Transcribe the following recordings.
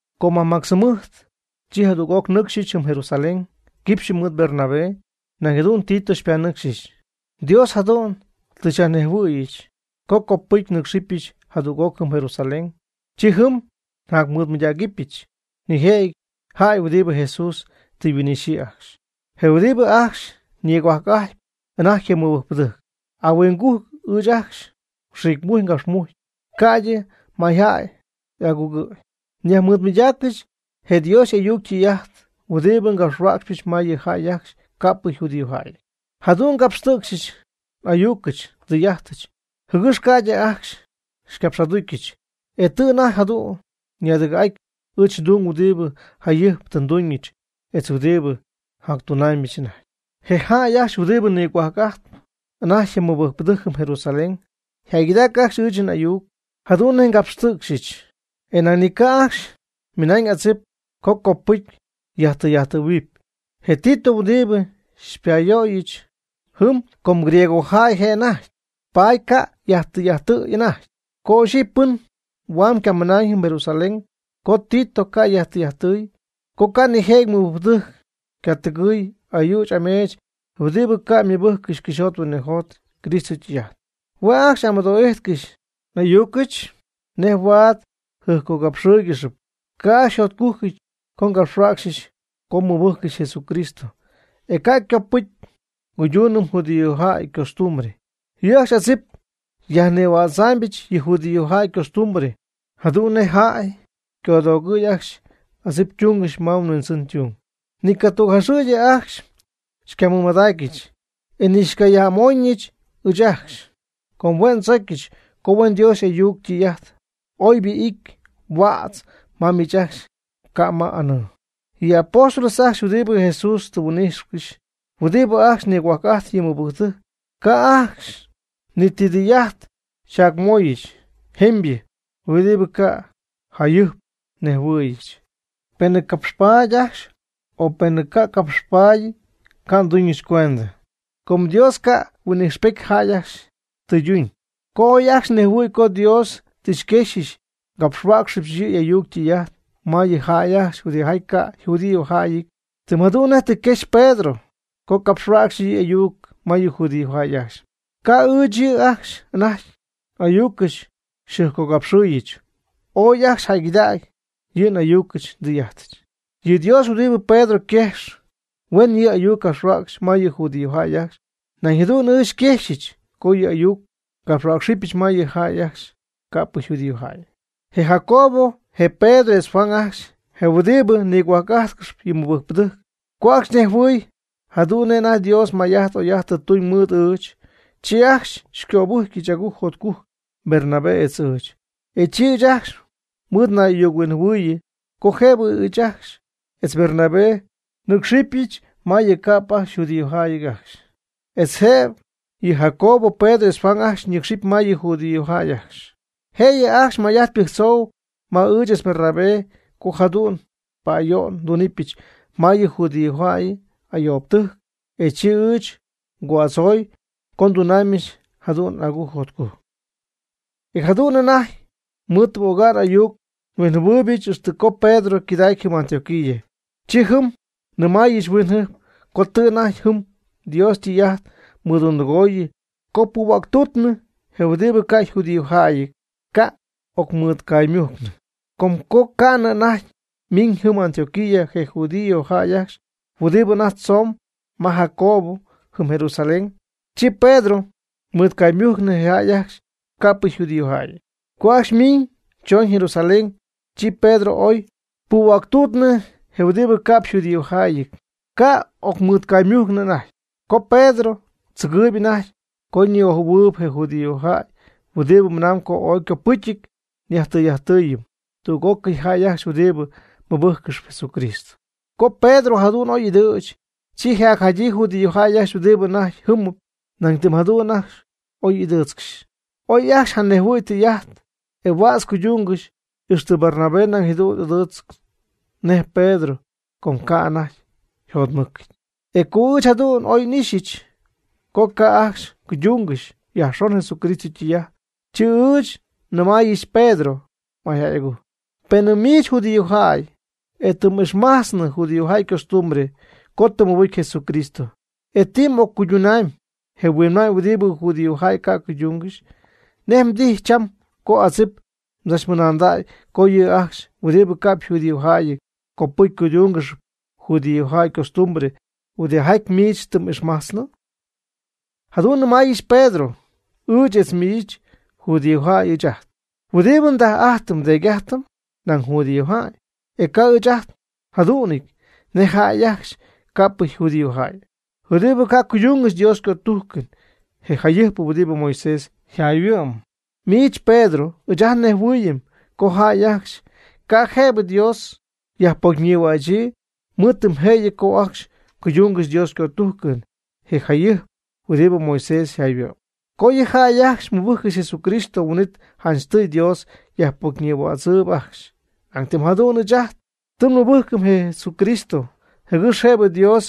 Co majmactz jɨmɨjt, chi jadüg'oc nnɨcxyɨch jɨm Jerusalén quipxyɨ mɨɨd Bernabé. Nañ jadu'n Tito xypanɨcxyɨch. Dios jadu'n tɨ xyajnejhuɨ̈yɨch co copɨcy nɨ́cxɨbɨch jadüg'oc jɨm Jerusalén. Chi jɨm nyajmɨɨdmɨydacyɨch nijëjɨty jäy huɨdibɨ Jesús tɨ yhuin'ixyii ajcxy, je huɨdibɨ ajcxy nigohuajc'ajtp anajty je mɨbɨjcpɨdɨjc. (Ahuingujc ɨɨch ajcxy nxiicmujcy ngapxmujcy, ca'ydɨ ymayjäy'agujcɨty.) Nyajmɨɨdmɨydactaayɨch je Dios y'ayuc ytɨy'ajt huɨdibɨ ngapxhuäcxypɨch ma yɨ jäy ajcxy ca'p yjudíojäyɨty. Jadu'n ngapxtɨ̈cxyɨch n'ayucɨch ndɨy'ajtɨch, jɨgɨx ca'ydɨ ajcxy xycapx'aducyɨch, e tɨ anajty jadu'ñyɨ ñaadɨgɨ̈'aty ɨɨch ndung huɨdibɨ jayɨjp tɨ nduuñɨch etz huɨdibɨ njactunaamybɨch anajty. Je jäy ajcxy huɨdibɨ nigohuajc'ajtp anajty je mɨbɨjcpɨdɨjc jɨm Jerusalén yjäygɨdac ajcxy ɨɨch n'ayuc jadu'n nej ngapxtɨ̈cxyɨch, e nañ ni ca' ajcxy ymɨnañ adzip co copɨcy yajtɨy'ajttɨ̈huɨpy je Tito huɨdibɨ xypa'oyɨch jɨm, com griegojäy je' anajty, paady ca' yajtɨy'ajttɨ̈y anajty. Ca' ixyipy pɨn huaam ycamɨnañ jɨm Jerusalén co Tito ca' yajtɨy'ajttɨ̈y, co ca' nijëjɨty mɨbɨjcpɨdɨjc ycatɨgɨ̈y ayüch ameech huɨdibɨ ca' ymɨbɨjccɨxy cɨxyjot huinɨjot Cristo ytɨy'ajt. Hue' ajcxy amɨdo'ijtcɨxy n'ayucɨch nej huaad xyjɨjpcogapxɨɨygɨxyɨch. Ca' ajcxy yjotcujcɨty co ngapxhuäcxyɨch co nmɨbɨjcɨm Jesucristo, e ca' copɨcy nguydunɨm judíojäy ycostumbre. Yɨ' ajcxy adzip xyajnïhuidzaambɨch yɨ judíojäy ycostumbre, jadu'n nej jäy codoogɨ̈yɨ ajcxy adzip ytuungɨxy ma yhuindzɨn ytung. Ni catügjaxɨ̈gy ajcxy xycamɨmadacyɨch, e ni xycayaj'amoñ ɨɨch ajcxy, com hue' ndzocyɨch co huen Dios y'ayuc ytɨy'ajt oybɨ ity huädz ma miich ajcxy ca' ma anɨɨ. Yɨ apóstoles ajcxy huɨdibɨ Jesús tɨ yhuin'íjxɨgɨxy huɨdibɨ ajcxy nigohuajc'ajtp yɨ mɨbɨjcpɨdɨjc, ca' ajcxy ni ti tɨy'ajt xyjacmöyɨch jemybɨ huɨdibɨ ca' jayɨjp nnejhuɨ̈yɨch. (Penɨ capxpaady ajcxy o penɨ ca' ycapxpaadyɨty, ca' nduuñɨch cuendɨ. Com Dios ca' huin'ixpety jäy ajcxy tɨyduñ.) Co oy ajcxy nejhuɨ̈y co Dios tɨ xyquexyɨch ngapxhuäcxyɨch yɨ' y'ayuc ytɨy'ajt ma yɨ jäy ajcxy huɨdijaty ca' yjudíojäyɨty, tɨm jadu'n nej tɨ quexy Pedro co capxhuäcxɨ yɨ' y'ayuc ma yɨ judíojäy ajcxy, ca' ɨɨch yɨ' ajcxy anajty n'ayucɨch xyjɨjpcogapxɨɨyɨch, ooy ajcxy jäygɨdacy yɨ n'ayucɨch ndɨy'ajtɨch. Yɨ Dios huɨdibɨ Pedro quejx huen yɨ' y'ayuc capxhuäcxy ma yɨ judíojäy ajcxy, nañ jadu'n ɨɨch xyquejxɨch co yɨ' y'ayuc ngapxhuäcxɨbyɨch ma yɨ jäy ajcxy ca'p yjudíojäyɨty. Je Jacobo, je Pedro etz Juan ajcxy, je huɨdi nigohuajc'ajtcɨxp yɨ mɨbɨjcpɨdɨjc, co ajcxy nejhuɨɨy jadu'n nej anajty Dios may'ajt oy'ajt tɨ tuuñ mɨɨd ɨɨch, chi ajcxy xycöbɨjcyɨch agujc jotcujc Bernabé etz ɨɨch. E chi ɨɨch ajcxy mɨɨd nay'ayuc-huinjɨhuɨɨyɨ co jëbɨ ɨɨch etz Bernabé nɨ́cxɨbɨch ma yɨ ca'p yjudíojäyɨty ajcxy, etz jëbɨ yɨ Jacobo, Pedro etz Juan ajcxy ñɨcxcɨxy ma yɨ judíojäy ajcxy. Jëyɨ ajcxy may'ajt pɨjctzoy ma ɨɨch etz Bernabé co jadu'n pa'ayo'n ndunɨpyɨch ma yɨ judíojäy ayoobɨtɨjc. E chi ɨɨch ngo'adzoy co ndunamybɨch jadu'n agujc jotcujc. E jadu'n anajty mɨɨd tɨ n'ocnay'ayuc-huinjɨhuɨ́ɨyɨbɨch ixtɨ coon Pedro ycɨdacy jɨm Antioquía. Chi jɨm nnɨmaayɨch huinjɨjp co tɨ anajty jɨm Dios ytɨy'ajt mɨdundɨgooyɨ co puhuäctuutnɨ je huɨdibɨ ca' yjudíojäyɨty, ca' y'ocmɨɨdcaymujcnɨ. Com co ca'nɨ anajty ymiñ jɨm Antioquía je judíojäy ajcxy huɨdibɨ anajty tzomb ma Jacobo jɨm Jerusalén, chi Pedro mɨɨdcaymujcnɨ je jäy ajcxy ca'p judíojäyɨty. Co ajcxy ymiiñ chooñ Jerusalén, chi Pedro oy puhuäctuutnɨ je huɨdibɨ ca'p yjudíojäyɨty, ca' y'ocmɨɨdcaymugaanɨ anajty. Com Pedro tzɨgɨɨyb anajty co ñi'ojɨ̈huɨɨyb je judíojäy huɨdibɨ mɨnamb co ooy ycopɨcyɨty yajtɨy'ajttɨ̈huɨpy tüg'ócɨy jäy ajcxy huɨdibɨ mɨbɨjccɨxp Jesucristo. Co Pedro jadu'n oy y'ɨdɨ̈ch, chi je jacjadyii judíojäy ajcxy huɨdi anajty jɨ́mɨp nañ tɨm jadu'n oy y'ɨdɨɨtzcɨxy. Oy ajcxy janejhuɨ̈y tɨy'ajt, e huädz cuydungɨxy. Ixtɨ Bernabé nañ jadu'n y'ɨdɨɨch nej Pedro, com ca' anajty yjotmɨcɨty. E co ɨɨch jadu'n oy n'ixyɨch co ca' ajcxy cuydungɨxy yajxon Jesucristo ytɨy'ajt, chi ɨɨch nnɨmaayɨch Pedro mayjäy'agujc: “Penɨ miich judíojäy, e tɨ m'ixmajtznɨ judíojäy ycostumbre co tɨ mɨbɨcy Jesucristo, e tɨ m'occuydumyb je huinma'ñ huɨdibɨ judíojäy ca' cuydungɨxy, ¿nej tijy cham co adzip mdzachmɨnaandägy co yɨ' ajcxy huɨdibɨ ca'p yjudíojäyɨty, copɨcy cuydúngɨxɨpy judíojäy ycostumbre, huɨdijaty miich tɨ m'ixmajtznɨ?” Jadu'n njacnɨmaayɨch Pedro: “Ɨɨch etz miich judíojäy ɨɨch ajt, huɨdibɨ ndaj'ajtɨm ndeedy'ajtɨm nañ judíojäy. E ca' ɨɨch ajt njadu'nɨty nej jäy ajcxy ca'pɨ yjudíojäyɨty, huɨdibɨ ca' cuydungɨxy Dios ycötujcɨn je jecyɨp huɨdibɨ Moisés yjayhuɨ'm. Miich Pedro ɨɨch ajt nnejhuɨɨyɨm co jäy ajcxy ca' jëbɨ Dios yajpocyñïhuächyii mɨɨd tɨm jëyɨ co ajcxy cuydungɨxy Dios ycötujcɨn je jecyɨp huɨdibɨ Moisés yjayhuɨ'm. Co yɨ jäy ajcxy mɨbɨjccɨxy Jesucristo, huin'it janchtɨy Dios yajpocyñïhuätzɨɨyb ajcxy. Nañ tɨm jadu'n ɨɨch ajt, tɨ nmɨbɨjcɨm je Cristo jɨgɨx jëbɨ Dios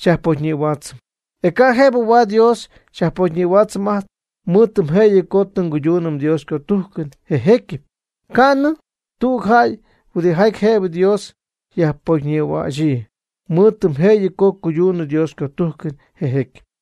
xyajpocyñïhuaatzɨm. E ca' jëbɨ huaad Dios xyajpocyñïhuaatzɨm ajt mɨɨd tɨm jëyɨ co tɨ nguyduunɨm Dios ycötujcɨn je jecyɨp. Ca' ni tüg jäy huɨdijaty jëbɨ Dios yajpocynïhuächyii, mɨɨd tɨm jëyɨ co cuyduunɨ Dios ycötujcɨn je jécyɨp.”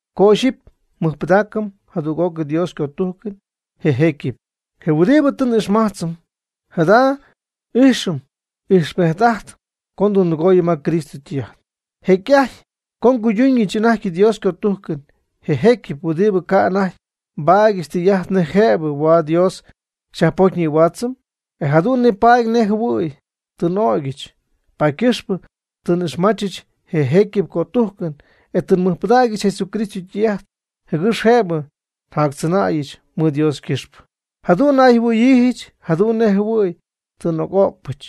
Co ixyipy nmɨjpɨdaacɨm jadüg'oc Dios ycötujcɨn je jecyɨp, je huɨdibɨ tɨ n'ixmajtzɨm, jada ixyipy ijxpejt'ajtp co ndundɨgooyɨm ma Cristo ytɨy'ajt. Jecy'ajty co nguyduunɨch anajty Dios ycötujcɨn je jecyɨp, huin'it ca' anajty nbaadyɨch tɨy'ajt nej jëbɨ huaad Dios xyajpocyñïhuaachɨch, e jadu'n nipaady nej jɨhuɨ̈y tɨ n'ögyɨch. Paady ycɨxpɨ tɨ n'ixmachɨch je jécyɨp cötujcɨn, e tɨ nmɨjpɨdägyɨch Jesucristo ytɨy'ajt jɨgɨx jëbɨ njactzɨnäyɨch mɨɨd Dios ycɨxpɨ. Jadu'n nayjɨhuɨ̈yiijɨch jadu'n nej jɨhuɨ̈y tɨ n'oc'o'cpɨch,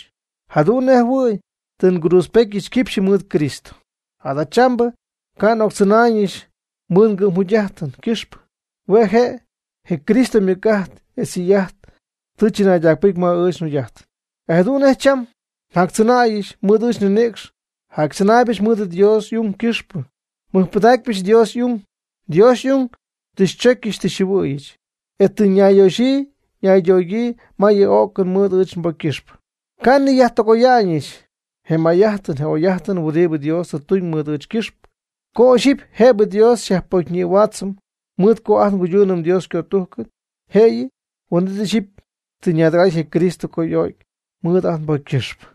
jadu'n nej jɨhuɨ̈y tɨ ngruudzpetyɨch quipxyɨ mɨɨd Cristo. Jadachambɨ ca' n'octzɨnaayñɨch mɨɨd ngɨ'm jugy'ajtɨn ycɨxpɨ. Hue' je' je Cristo ymɨc'ajt etz ytɨy'ajt tɨ chɨnaydacpɨcy ma ɨɨch njugy'ajtɨn. E jadu'n nej cham njactzɨnäyɨch mɨɨd ɨɨch nninïcx, jactzɨnaaybɨch mɨɨd Dios y'ung ycɨxpɨ, nmɨjpɨdacypɨch Dios y'ung. Dios y'ung tɨ xychocyɨch tɨ xyjɨhuɨ̈yɨch, e tɨ nayyoxyii naydogyii ma yɨ o'cɨn mɨɨd ɨɨch nbocy ycɨxpɨ. Ca' nniyajtɨgoya'ñɨch je may'ajtɨn je oy'ajtɨn huɨdibɨ Dios tɨ tuuñ mɨɨd ɨɨch ycɨxpɨ. Co ixyipy jëbɨ Dios xyajpocyñïhuaatzɨm mɨɨd co ajt nguydunɨm Dios ycötujcɨn jëyɨ, huin'it ixyipy tɨ ñaadɨgɨ̈'aty je Cristo co y'o'cy mɨɨd ajt nbocy ycɨxpɨ.